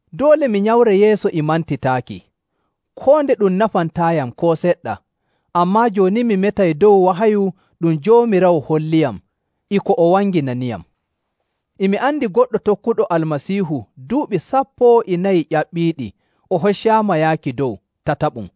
Doole mi nyamray yeeso e mantitaaki, koo nde ɗum nafantaayam koo seɗɗa, ammaa jooni mi metay dow wahayu ɗum Joomiraawo holliyam e ko o wanginaniyam. E mi andi goɗɗo tokkuɗo Almasiihu duuɓi sappo e nayi ƴaɓɓiiɗi o hoccaama yaaki dow tataɓum.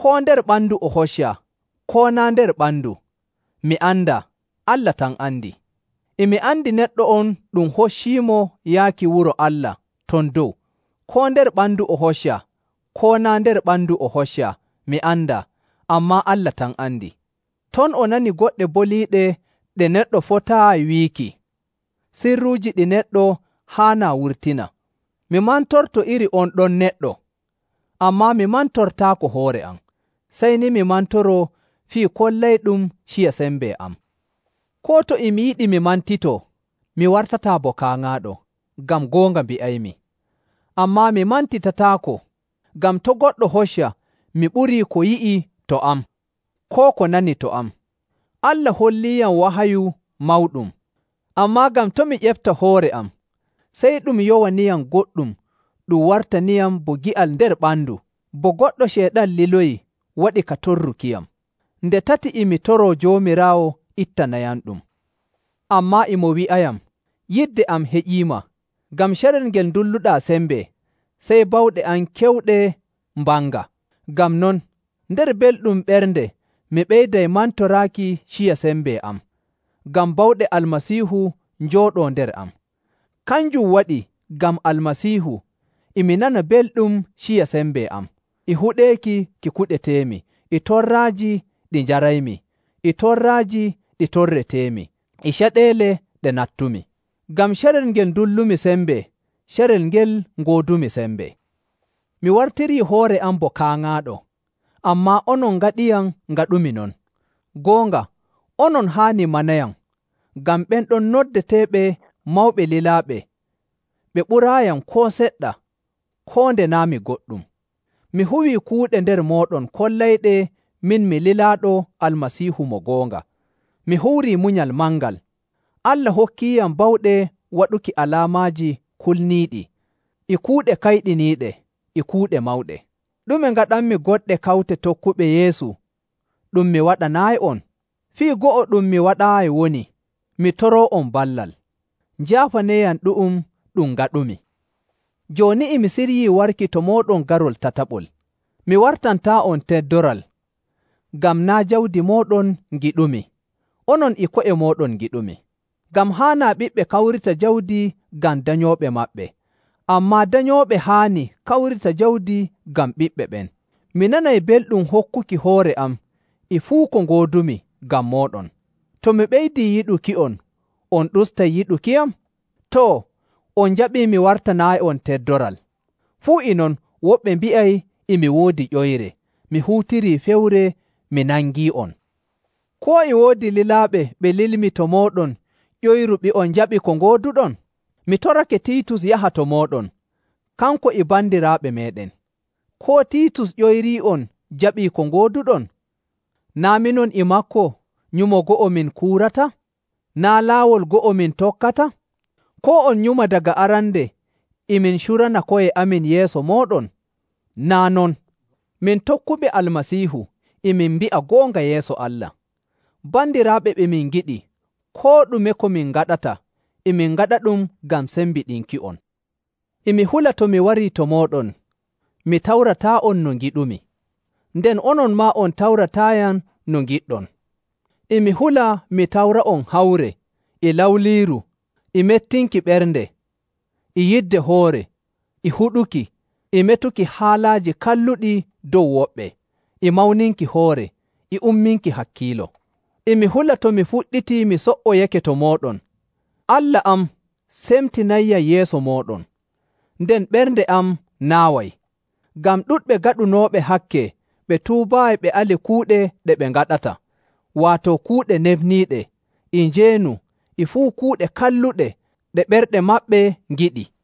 Koo nder ɓandu o hoccaa, koo naa' nder ɓandu, mi andaa, Allah tan andi. E mi andi neɗɗo on ɗum hocciimo yaaki wuro Allah ton dow, koo nder ɓandu o hoccaa, koo naa' nder ɓandu o hoccaa mi andaa, ammaa Allah tan andi. Ton o nani goɗɗe boliiɗe ɗe neɗɗo fotaayi wiiki, sirruuji ɗi neɗɗo haanaa wurtina. Mi mantorto iri on ɗon neɗɗo, ammaa mi mantortaako hoore am, sey ni mi mantoroo fii kollayɗum ciya sembe am. Koo to e mi yiɗi mi mantitoo, mi wartataa bo kaaŋaaɗo, ngam goonga mbi'aymi. Ammaa mi mantitataako, ngam to' goɗɗo hocca mi ɓurii ko o yi'i to am koo ko nani to am. Allah holliiyam wahayu mawɗum. Ammaa ngam to' mi ƴefta hoore am, sey ɗum yowaniyam goɗɗum ɗum wartaniyam bo gi'al nder ɓandu, bo goɗɗo Ceyɗan liloyi waɗa ka torrukiyam. Nde tati e mi toroo Joomiraawo ittanayamɗum, ammaa e mo wi'ayam, “Yidde am heƴiima, ngam carel ngel ndulluɗaa sembe, sey bawɗe am kewɗe mbanga.” Ngam non, nder belɗum ɓernde mi ɓeyday mantoraaki ciya sembe am, ngam bawɗe Almasiihu njooɗoo nder am. Kanjum waɗi ngam Almasiihu e mi nana belɗum ciya sembe am, e huɗeeki ki kuɗeteemi, e torraaji ɗi njaraymi, e torraaji ɗi torreteemi, e caɗeele ɗe nattumi. Ngam carel ngel ndullumi sembe, carel ngel ngoodumi sembe. Mi wartirii hoore am bo kaaŋaaɗo, ammaa onon ngaɗiyam ngaɗumi non. Goonga, onon haani manayam, ngam ɓen ɗon noddeteeɓe “mawɓe lilaaɓe” ɓe ɓuraayiyam koo seɗɗa, koo nde naa' mi goɗɗum. Mi huwii kuuɗe nder mooɗon kollayɗe min mi lilaaɗo Almasiihu mo goonga, mi huwirii munyal mangal. Allah hokkiiyam bawɗe waɗuki alaamaaji kulniiɗi, e kuuɗe kayɗiniiɗe, e kuuɗe mawɗe. Ɗume ngaɗanmi goɗɗe kawte tokkuɓe Yeesu ɗum mi waɗanaayi'on? Fii go'o ɗum mi waɗaayi woni mi toroo'on ballal. Njaafaneeyam ɗu'um ɗum ngaɗumi! Jooni e mi siryii warki to mooɗon garol tataɓol. Mi wartantaa'on teddoral, ngam naa' jawdi mooɗon ngiɗumi, onon e ko'e mooɗon ngiɗumi. Ngam haanaa ɓiɓɓe kawrita jawdi ngam danyooɓe maɓɓe, ammaa danyooɓe haani kawrita jawdi ngam ɓiɓɓe ɓen. Mi nanay belɗum hokkuki hoore am e fuu ko ngoodumi ngam mooɗon. To mi ɓeydii yiɗuki'on, on ustay yiɗukiyam? Too, on njaɓii mi wartanaayi'on teddoral. Fuu e non woɓɓe mbi'ay e mi woodi ƴoyre, mi huutirii fewre mi nangii'on. Koo e woodi lilaaɓe ɓe lilmi to mooɗon ƴoyruɓe'on njaɓi ko ngooduɗon? Mi torake Tiitus yaha to mooɗon, kanko e bandiraawo meeɗen. Koo Tiitus ƴoyrii'on jaɓii ko ngooduɗon? Naa' minon e maako nyumo go'o min kuurata. Naa' laawol go'o min tokkata? Koo on nyuma daga arande e min curana ko'e amin yeeso mooɗon? Naa' non! Min tokkuɓe Almasiihu, e min mbi'a goonga yeeso Allah. Bandiraaɓe ɓe min ngiɗi, koo ɗume ko min ngaɗata e min ngaɗaɗum ngam sembiɗinki'on. E mi hula to mi warii to mooɗon, mi tawrataa'on no ngiɗumi, nden onon maa on tawrataayam no ngiɗɗon. E mi hula mi tawra'on hawre, e lawliiru, e mettinki ɓernde, e yidde hoore, e huɗuki, e metuki haalaaji kalluɗi dow woɓɓe, e mawninki hoore, e umminki hakkiilo. E mi hula to mi fuɗɗitii mi so''oyake to mooɗon, Allah am semtinayyam yeeso mooɗon, nden ɓernde am naaway, ngam ɗuɗɓe gaɗunooɓe hakke ɓe tuubaayi ɓe ali kuuɗe ɗe ɓe ngaɗata, waato kuuɗe nefniiɗe, e njeenu, e fuu kuuɗe kalluɗe ɗe ɓerɗe maɓɓe ngiɗi.